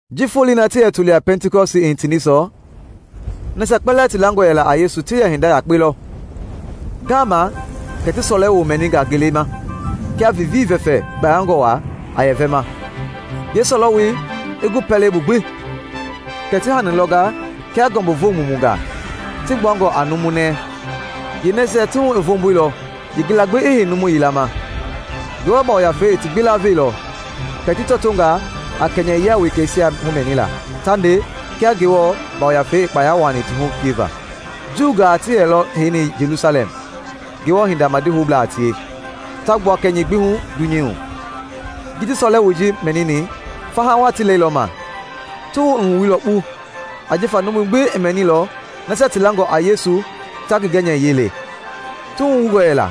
Ji foloi na ti yɛ toli a Pɛntikɔsti i hitini sɔ, nasia kpɛlɛɛ ti langɔ yɛla a Yesu ti yɛ hinda yakpe lɔ. Ngaama kɛ ti sɔlɛwoo mɛninga ngelei ma kia vivii vɛfɛ gbayangɔ waa a yɛ vɛma, yeesɔlɛwoi i gu pɛlei bu gbi. Kɛ ti hani lɔnga kia ngɔmbuvo mumungaa, ti gbuangɔ a numu nɛi. Yeenɛisia ti hu i voomboilɔ yeengila gbi i hei numu yila ma. Ngewɔ Yafei i ti gbi laveilɔ, kɛ ti tɔtonga a kɛnyɛyia wekeisia humɛnila, ta nde, kia Ngewɔ Yafei i kpaya wuaani ti hu pieva. Juungaa ti yɛlɔ heini Jelusalɛm Ngewɔ hinda madi houblaa a tie, ta gbua kɛnyɛi gbi hu dunyei hu. Ji ti sɔlɛwoi ji mɛnini, faha waa ti lɛilɔma. Ti wuhu i wuilɔ kpu ajifa numui gbi i mɛnilɔ nasia ti langɔ a Yesu ta ngi gɛnyɛyiɛi le. Ti wuhu wungɔ yɛla,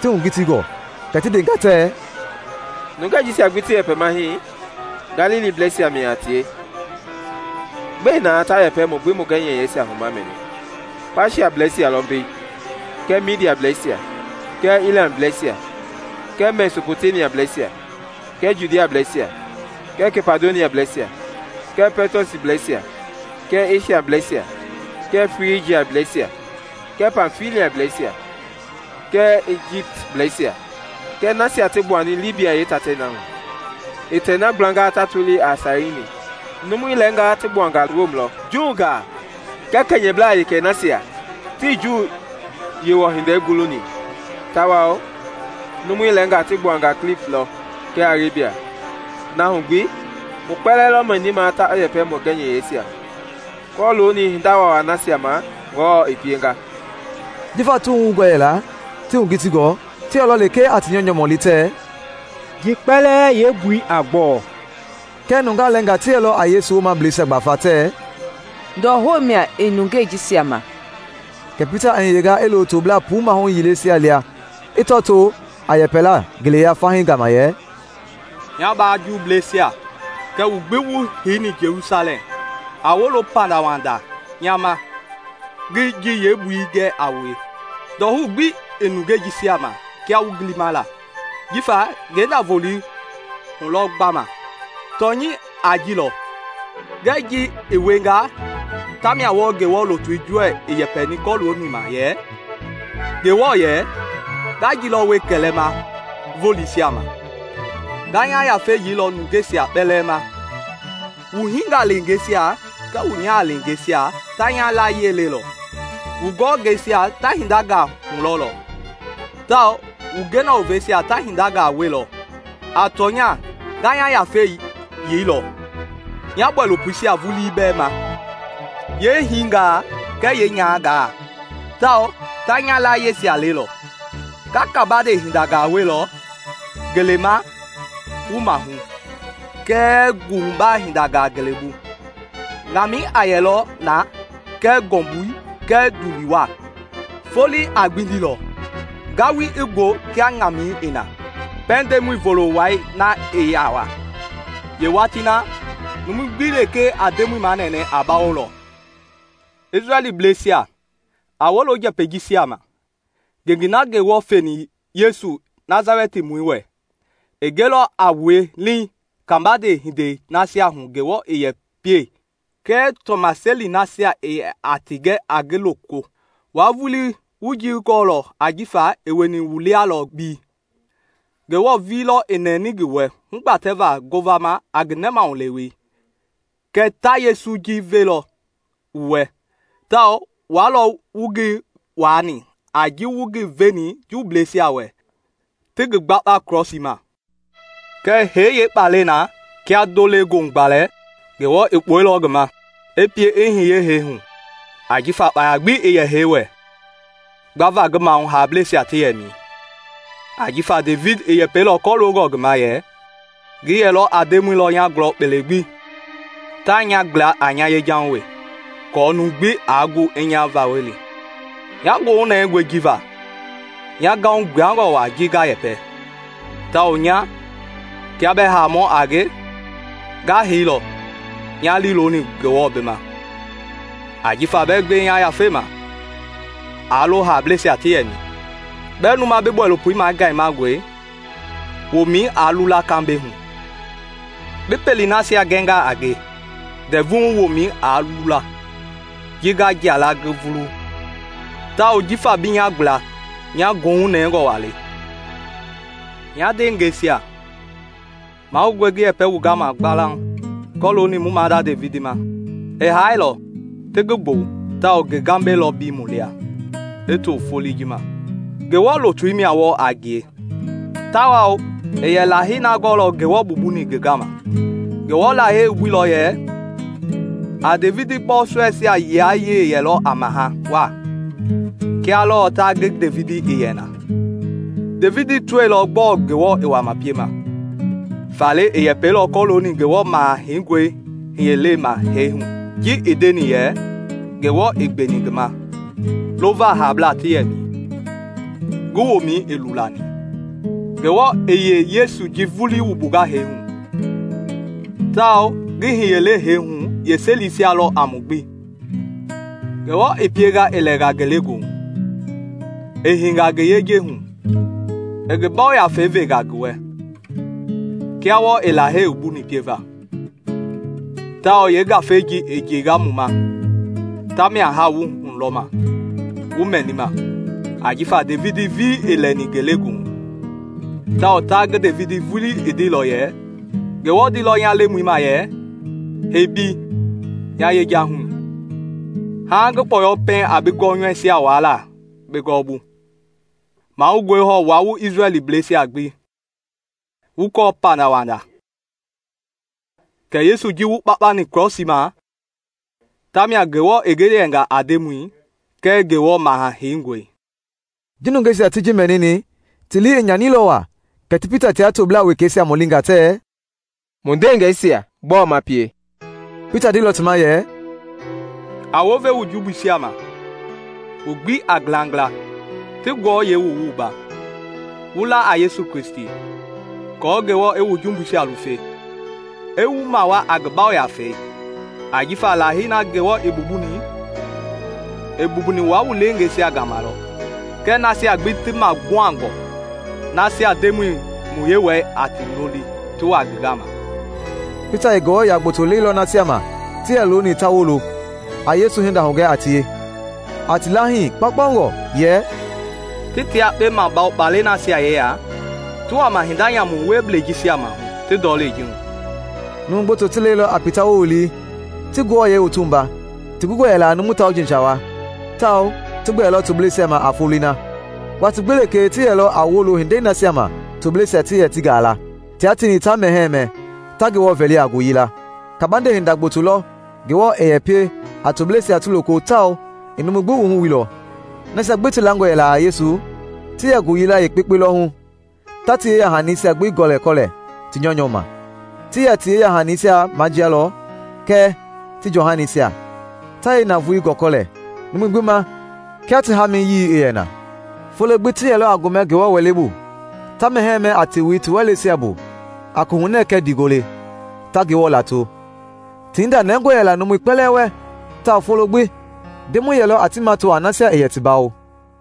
ti kitingɔ, kɛ ti ndenga tɛɛ, “Nungɛi jisia gbi ti yɛpɛma hii, Galiliblɛisia mia a tie! Gbɛe na ta yɛpɛ mu gbi mu gɛnyɛyiɛisia hu ma mɛni? Paatiablɛisia lɔ mbei kɛɛ Midiableisia kɛɛ Ilamblɛisia kɛɛ Mesɔpɔtemiableisia kɛɛ Judiablɛisia kɛɛ Kapadosiablɛisia kɛɛ Pɔtɔsblɛisia kɛɛ Esiablɛisia kɛɛ Frijiablɛisia kɛɛ Pamfiliablɛisia kɛɛ Ijiptblɛisia kɛɛ nasia ti gbuani Libia yeetatei na hu i tei na gblanga ta tolia Sairini. Numui lɛɛngaa ti gbuanga Rom lɔ, Juungaa kɛɛ kɛnyɛblaa wekei nasia ti Juu Yewɔ Hindei guluni; tawao numui lɛɛngaa ti gbuanga Kliti lɔ kɛɛ Arebia na hu gbi mu kpɛlɛɛ lɔ mɛnima ta yɛpɛ mu gɛnyɛyiɛisia hu kɔlooni hinda waawai nasia ma Ngewɔ i pienga!” Jifa ti wuhu wungɔ yɛla, ti kitingɔ, ti yɛlɔ lekee a ti nyɔunyɔ mɔli tɛɛ, “Ji kpɛlɛɛ yeembui a gbɔɔ?” Kɛɛ nungaa lɛɛngaa ti yɛlɔ a Yesu womableisia gbafa tɛɛ, “Ndɔhou mia i nungei jisia ma.” Kɛ Pita i hiyenga i lo toblaa puu maahu yileisia lia i tɔtoo a yɛpɛlaa ngeleya fahii gama yɛ, “Nya mbaa Juuisia, kɛɛ wu gbi wu heini Jelusalɛm, a wolo pandawanda nya ma ngi ji yeembui gɛ a wue. Ndɔhou gbi ii nungei jisia ma kia wu gilima la, jifa ngenda-volei hulɔ gbama. Tɔnyɛi a ji lɔ kɛ ji i wienga tamia wɔɔ Ngewɔ lutui Joɛl i yɛpɛni kɔlooni ma yɛ, ‘Ngewɔ yɛ, Nga ji lɔ wie kɛlɛma voleisia ma: Nga nya Yafei yeilɔ nungeisia kpɛlɛɛ ma. Wu hingaleengeisia kɛɛ wu nyahaleengeisia ta nya layie lelɔ; wu gɔngɛisia ta hindangaa hulɔlɔ, tawao wu gena woveisia ta hengangaa wielɔ. A tɔnya nga nya Yafei yeilɔ nya bɔilopoisia vulii bɛɛ ma, yeehingaa kɛɛ yeenyahangaa, tawao ta nya layieisia lelɔ. Nga kabande hindangaa wielɔ ngelei ma wu maahu, kɛɛ nguhubaa hindangaa ngelebu. Ŋamɛi a yɛlɔ na kɛɛ ngɔmbui kɛɛ ndulii waa; foloi a gbindilɔ, ngalui i gbɔu kia ŋamɛi i na, pɛiŋ Ndemɔi Volo wai na i yaa wa. Yeewatii na, numu gbi lekee a Ndemɔi manɛnɛ a bawolɔ.’ “Isrɛlbleisia, a wolo njɛpɛi jisia ma. Ngengei na Ngewɔ feni Yesu Nasalɛtimɔi wɛ, i gɛilɔ a wue leeŋ kabande hindei nasia hu Ngewɔ i yɛ pie kɛɛ tɔmaseli nasia i yɛ ti gɛ a ngi loko; wua vulii wu ji gɔɔlɔ ajifa i wieni wu lia lɔ mbei. Ngewɔ vulii lɔ i nɛni ngi wɛ hugbatɛva ngovama a ngi nɛmahulewei kɛ ta Yesu ji velɔ wu wɛ; tawao wua lɔ wu ngi waani a ji wu ngi veni jumbubleisia wɛ ti ngi gbakpa krɔsii ma. Kɛɛ hee yeekpalɛi na kia ndo-le-goohugbalɛ, Ngewɔ i kpuɛilɔ ngi ma, i pie i hiye hee hu ajifa kpaya gbi ii yɛ hee wɛ gbava ngi maahu haableisia ti yɛmɛi. Ajifa Devidi i yɛpɛilɔ kɔloongɔ ngi ma yɛ, ‘Ngi yɛlɔ a Ndemɔi lɔ nya gulɔ kpele gbi; taa nya gbla a nya yejahu wee, aako numu gbi aa gu i nya vawɔli. Nya goohu nɛngɔe ji va nya gahu gbuangɔ waa ji nga yɛpɛ; tawao nya, kia bɛɛ haamɔ a nge, nga heilɔ nya lii looni Ngewɔ bi ma, ajifa bɛɛ gbe nya yafei ma aa lo haableisia ti yɛmɛi; bɛɛ luma bi bɔilopo magayemangɔi womɛi aa lula kambɛihu! Bi pelei nasia gɛnga a nge ndɛvui hu womɛi aa lula! Nge nga jia la ngi vulu, tawao jifa bi nya gbla nya goohu nɛngɔ waa le.’ “Nya ndeengɛisia, mahoungɔe ngi yɛpɛ wu gama gbalauŋ kɔlooni mu maada Devidi ma. I haailɔ, ti ngi gbɔwu, tawao ngi gambɛi lɔ mbei mu lia i to foloi ji ma. Ngewɔ lutu mia wɔɔ a ngie tawao i yɛ Lahei na gɔɔlɔ Ngewɔ mbumbuni ngi gama; Ngewɔ Lahei wumbuilɔ yɛ a Devidi bɔɔsɔɛisia yilayee yɛlɔ a maha waa, kia lɔɔ ta ngi Devidi i yɛ na. Devidi tɔilɔ gbɔɔ Ngewɔ i wama piema, faale i yɛpɛilɔ kɔlooni Ngewɔ Maha Heingɔi hiyelei ma hee hu ji i ndeni yɛ, ‘Ngewɔ ii gbeni ngi ma lova haablaa ti yɛmɛi; ngi womɛi ii lulani.’ Ngewɔ i yee-Yesu ji vulii wumbunga hee hu, tawao ngi hiyelei hee hu yeeselisia lɔ a mu gbi. Ngewɔ i pienga i lɛnga ngelegoohu, i heinga ngi yejei hu, i Ngi Yafei venga ngi wɛ kia wɔɔ i Lahei wumbuni pieva; tawao yee-Ngafei ji i njeinga mu ma, tamia haa wu hulɔma, wu mɛnima. Ajifa Devidi vulii ii lɛni ngelegoohu; tawao ta Devidi vulii i ndeilɔ yɛ, ‘Ngewɔ ndeilɔ nya Lemɔi ma yɛ, Hei mbei nya yejahui, haaŋ ngi kpɔyɔ pɛiŋ a bi gɔnyɔuisia wuaala bi gɔɔbu.’ “Mahoungɔe hɔɔ wua wu Isrɛlbleisia gbi wu kɔɔ pandawanda kɛ Yesu ji wu kpakpani krɔsii ma, tamia Ngewɔ i ngi yɛnga a Ndemɔi kɛɛ Ngewɔ Maha Heingɔi!” Ji nungeisia ti ji mɛnini, ti lii i nyanilɔ waa, kɛ ti Pita tia toblaa wekeisia mɔlinga tɛɛ, “Mu ndeengɛisia, gbɔɔ ma pie?” Pita ndeilɔ ti ma yɛ, “A wounve wu jumbuisia ma, wu gbi a ngilangila, ti wu wua, wu la a Yesu Kristi, aako Ngewɔ i wu jumbuisia lufe, i wu mawaa a Ngi Yafei. Ajifa Lahei na Ngewɔ i mbumbuni, i mbumbuni wua wu leengeisia gama lɔ, kɛɛ nasia gbi ti maguhangɔ nasia Ndemɔi mu Yewɔɛi a ti loli ti wa ngi gama.” Pita i Ngewɔ yia gboto leilɔ nasia ma ti yɛ looni ta wolo, a Yesu hinda hugɛ a tie, a ti laahii kpaukpaungɔ yɛ, “Ti tia yekpe mabawo kpalɛi nasia yeya ti wama hinda nyamu wieblɛi jisia maahu ti ndɔlei ji hu.” Numu gboto ti lɛilɔ a Pita woowili, ti ti wua; ti gungɔ yɛla a numu tauji sawa tawao ti gbɛɛlɔ tobleisia ma a foloi na. Watii gbi lekee ti yɛlɔ a wolo hindei nasia ma tobleisia ti yɛ ti gaa la, tia tieni ta mɛhɛɛ mɛ, ta Ngewɔ vɛli a ngoyila. Kabande hinda gboto lɔ Ngewɔ i yɛ pie a tobleisia ti loko tawao i numui gbi wuhu wuilɔ. Nasia gbi ti langɔ yɛla a Yesu ti yɛ ngooyila yekpeyekpe lɔ hu, ta ti yeyahanisia gbi gɔlɛkɔlɛ ti nyɔunyɔ ma. Ti yɛ ti yeyahanisia majialɔ kɛɛ ti jɔhanisia ta yeenavoei gɔlɛkɔlɛ numui gbi ma kia ti hamiyii i yɛ na. Folo gbi ti yɛlɔ a gomɛ Ngewɔ Wɛlei bu, ta mɛhɛɛ mɛ a tewei ti wɛleisia bu a kohunɛ kɛɛ ndiigole, ta Ngewɔ lato. Ti hinda nɛngɔ yɛla numui kpɛlɛɛ wɛ tawao folo gbi Ndemɔi yɛlɔ a ti mato a nasia i yɛ ti bawoma.